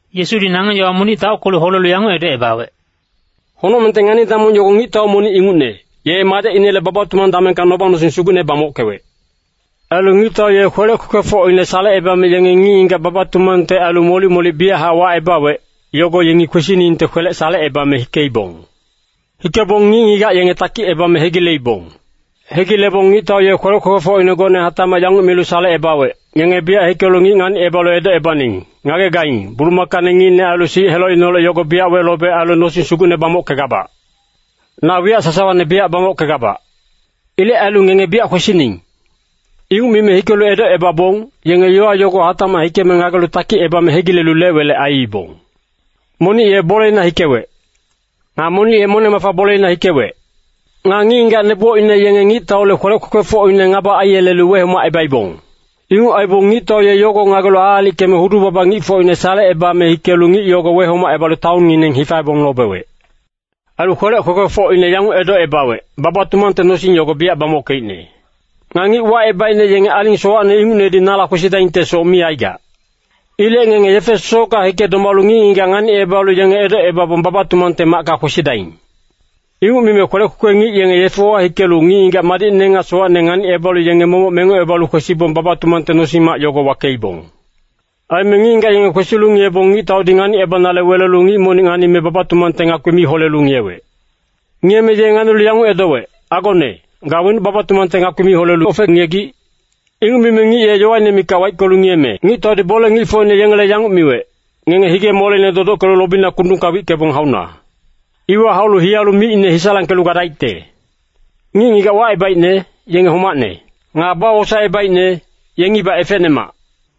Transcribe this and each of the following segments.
Yesudi nangeng yowa monic taockelu holelu yanguc edocebawec, “Honocmengte ngani-damong yogo ngictau monic ingucne, ye madecinele baba-tumang damengka noba-nosing sugucne bamockewec. Ailu ngictau ye kwelec kwekwefocine salecebame yenge ngic-ngigac baba-tumangte ailu molic-molic biyachac wacebawec, yogo yengi kwesiningte kwelec salecebame hikeibong. Hikebong ngic-ngigac yenge takicebame hegileibong. “Hegilebong ngictau ye kwelec kwekwefocine gocne hatacmac yanguc milu salecebawec, ‘Ngenge biyac hikelu ngic nganicebalu edocebaning, “Ngagegaing, bulumakane ngicne ailu sic helocineholec yogo biyac welobec ailu nosing sugucne bamockegabac. Na wiyac sasawane biyac bamockegabac. Ilec ailu ngenge biyac kwesining.” ’ “Inguc mime hikelu edocebabong, yenge yowa yogo hatacmac hikeme ngagelu takicebame hegilelu lec-welec aiibong. Monic ye boleina hikewec. Nga monic ye moneng-mafa boleina hikewec. Nga ngic-ngigac nebocine yenge ngictaule kwelec kwekwefocine ngaba aiyelelu wehomacebaibong. Inguc aibong ngictau ye yogo ngagelu aalickeme hudu-baba ngicfocine salecebame hikelu ngic yogo wehomacebalu taonngineng hifaebong lobewec. “Ailu kwelec kwekwefocine yanguc edocebawec, ‘Baba-tumangte nosing yogo biyac bamockeicne. Nga ngic wacebaicne yenge aling sowacne ingucnedi nala kwesidaingtesoc mi aigac. Ilec ngenge yefe sosocka hike domalu ngic-ngigac nganicebalu yenge edocebabong baba-tumangte macka kwesidaing.’ Inguc mime kwelec kwekwe ngic yenge yefewa hikelu ngic-ngigac madicne nga sowacne nganicebalu yenge momoc mengocebalu kwesibong baba-tumangte nosing-mac yogo wakeibong. “Aime ngic-ngigac yenge kwesilu ngiyebong ngictaudi nganicebanale welelu ngic monic nganime baba-tumangte ngakpi mi holelu ngiyewec. Ngiyeme ye nganilu yanguc edowec, ‘Agone, ga wenuc baba-tumangte ngakpi mi holelu ofe-ngiyegic?’ “Inguc mime ngic ye yowaine mikac waickelu ngiyeme ngictaudi bole-ngicfocine yengele yanguc miwec, ‘Ngenge hige-moleine dodockelu lobina kundungka wickebong hauna. Iwa haulu hiyalu micine hisalangkelu gadaicte.’ “Ngic-ngigac wacebaicne, yenge homacne. Nga bawosaecebaicne, yengibac efecnemac.”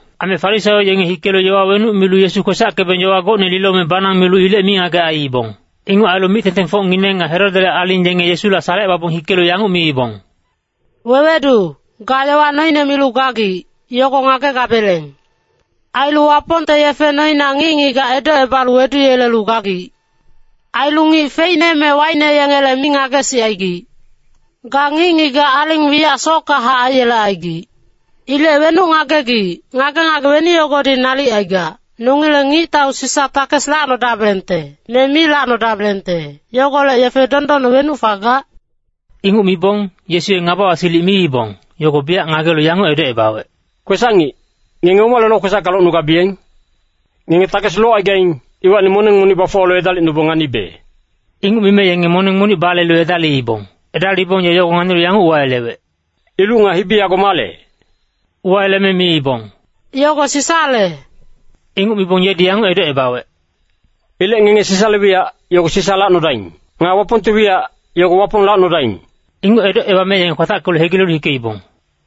Aime Farisaio yenge hikelu yowa wenuc milu Yesu kwesackebeng yowa gocne lilome banang milu ilec mingagec aiibong. Inguc ailu mic-tengtengfocngineng nga Herodele aling yenge Yesula salecebabong hikelu yanguc miibong, “Wewedu, ga yowa noine milu gagic, yogo ngagegabeleng. Ailu Wapongte yefe noina ngic-ngigac edocebalu weduyelelu gagic. Ailu ngic feicne me waicne yengele mi ngagesicaigic. Ga ngic-ngigac aling wiyac sockahac aiyelecaigic. Ilec wenuc ngagegic, ngage-ngage weni yogodi nalic aigac, nongileng ngictau Sisa takes lacnodabelengte, me mi lacnodabelengte, yogolec yefe dondonne wenuc fagac?” Inguc mibong, Yesu ye ngabawa-silic miibong, yogo biyac ngagelu yanguc edocebawec, “Kwesac-ngic, ngenge omale lokwesacka locnugabiyeng? Ngenge takes locaigaing, iwacni moneng monic bafuwalu edalicnubong nganibe.” Inguc mime yenge moneng monic balelu edaliibong. Edalibong ye yogo nganilu yanguc uwayelewec, “Iluc nga hibi yago male?” Uwayeleme miibong, “Yogo Sisale.” Inguc mibong yedi yanguc edocebawec, “Ilec ngenge Sisale wiyac, yogo Sisa lacnodaing. Nga Wapongte wiyac, yogo Wapong lacnodaing!” Inguc edocebame yenge kwatackelu hegilelu hikeibong.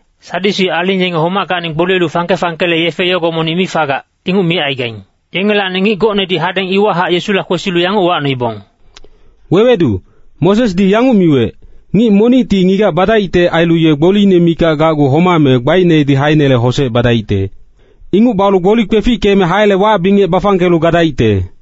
Sadyusi aling yenge homackacni gboliyelu fangke-fangkele yefe yogo monic mi fagac, inguc micaigaing. Yengelacni ngic gocnedi hadeng iwahac Yesula kwesilu yanguc uwacnoibong, “Wewedu, Mosesdi yanguc miwec, ‘Ngic monicti ngigac badaicte ailu ye gboliine mikac gacgu homame gbainedi haeinele hosec badaicte. Inguc balu gboli kwefickeme haele wac-bingec bafangkelu gadaicte.’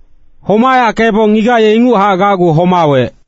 Homayackebong ngigac ye inguchac gacgu homawec.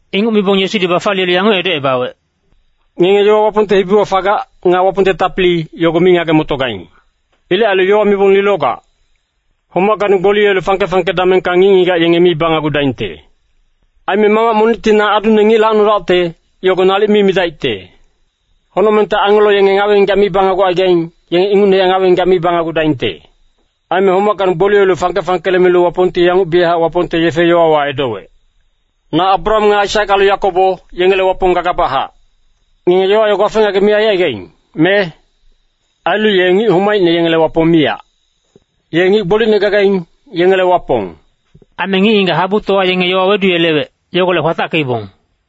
Inguc mibong Yesudi bafaliyelu yanguc edocebawec, “Ngenge yowa Wapongte hibiwa fagac, nga Wapongte tapili, yogo mi ngage-motogaing. Ilec ailu yowa mibong lilogac. Homackacni gboliyelu fangke-fangke damengka ngic-ngigac yenge mi banagudaingte. Aime mamac monicti ‘Na adune ngic lacnodacte,’ yogo nalic mi midaicte. Honocmengte angelo yenge ngawe-ngigac mi banagucaigaing, yenge ingucnehac ngawe-ngigac mi banagudaingte. Aime homackacni gboliyelu fangke-fangkele milu Wapongti yanguc biyachac Wapongte yefe-yowawa edowec, ‘Na Abraham nga Aisak ailu Yakobo, yengele Wapong gagabachac.’ Ngenge yowa yogo wafe-ngagec mi aicaigaing, me? Ailu ye ngic homaicne yengele Wapong miyac. Ye ngic gbolicne gagaing, yengele Wapong.” Aime ngic-ngigac habutowa yenge yowa weduyelewec, yogolec kwatackeibong.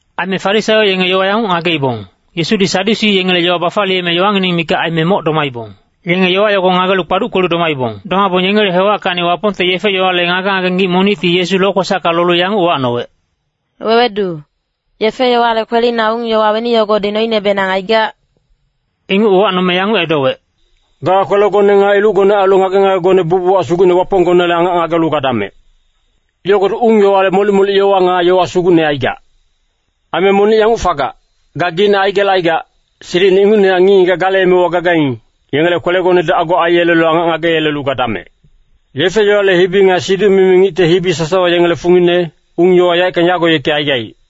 Aime Farisaio yenge yowa yanguc ngageibong, “Yesudi Sadyusi yengele yowa bafaliyeme yowangineng mikac aime moc domaibong.” Yenge yowa yogo ngagelu kpaduckelu domaibong. Domabong yengele hewackacni Wapongte yefe-yowale ngage-ngage ngic monicti Yesu lokwesacka lolu yanguc uwacnowec, “Wewedu, yefe-yowale kwelina ung-yowa weni yogodi noinebenang aigac?” Inguc uwacnome yanguc edowec, “ ‘Ga kwelegone nga ilucgone ailu ngage-ngagegone bucbuchac Sugucne Waponggonele angac ngagelu gadamec.’ Yogodi ung-yowale molic-molic yowa nga yowa sugucne aigac. Aime monic yanguc fagac, ‘Gageicne aigelecaigac, silicine ingucnehac ngic-ngigac gale emewa gagaing, yengele kwelegonedi ago aiyelelu angac ngageyelelu gadamec.’ Yefe-yowale hibi nga siduc-mimi ngicte hibi sasawa yengele fungine, ung-yowa yaeckang yago yeki aigaic.”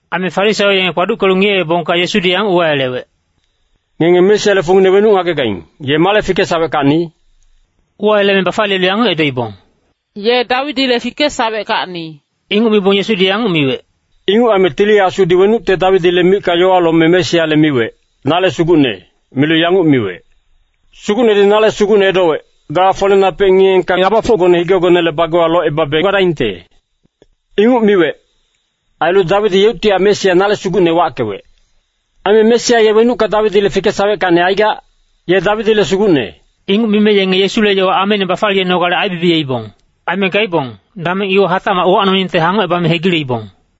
Aime Farisaio yenge kpaduckelu ngiyeebongka Yesudi yanguc uwayelewec, “Ngenge Mesiale fungine wenuc ngagegaing, ye male fikesaweckacni?” Uwayeleme bafaliyelu yanguc edoibong, “Ye Dawidile fikesaweckacni.” Inguc mibong Yesudi yanguc miwec, “Inguc aime Tili Asudi wenucte Dawidile micka yowa lome Mesiale miwec, ‘Nale Sugucne,’ milu yanguc miwec, ‘Sugucnedi nale Sugucne edowec, “Ga folenapec ngiyeengka ngabafocgone higegonele bagewa locebabe gadaingte.” ’ Inguc miwec. Ailu Dawidi yeuctihac Mesia ‘Nale Sugucne’ wackewec. Aime Mesia ye wenucka Dawidile fikesaweckacni aigac? Ye Dawidile Sugucne.” Inguc mime yenge Yesule yowa ameine bafaliyenogale aibibiyeibong. Aime gaibong, dameng iwa hatacmac uwacnoningte hangocebame hegileibong.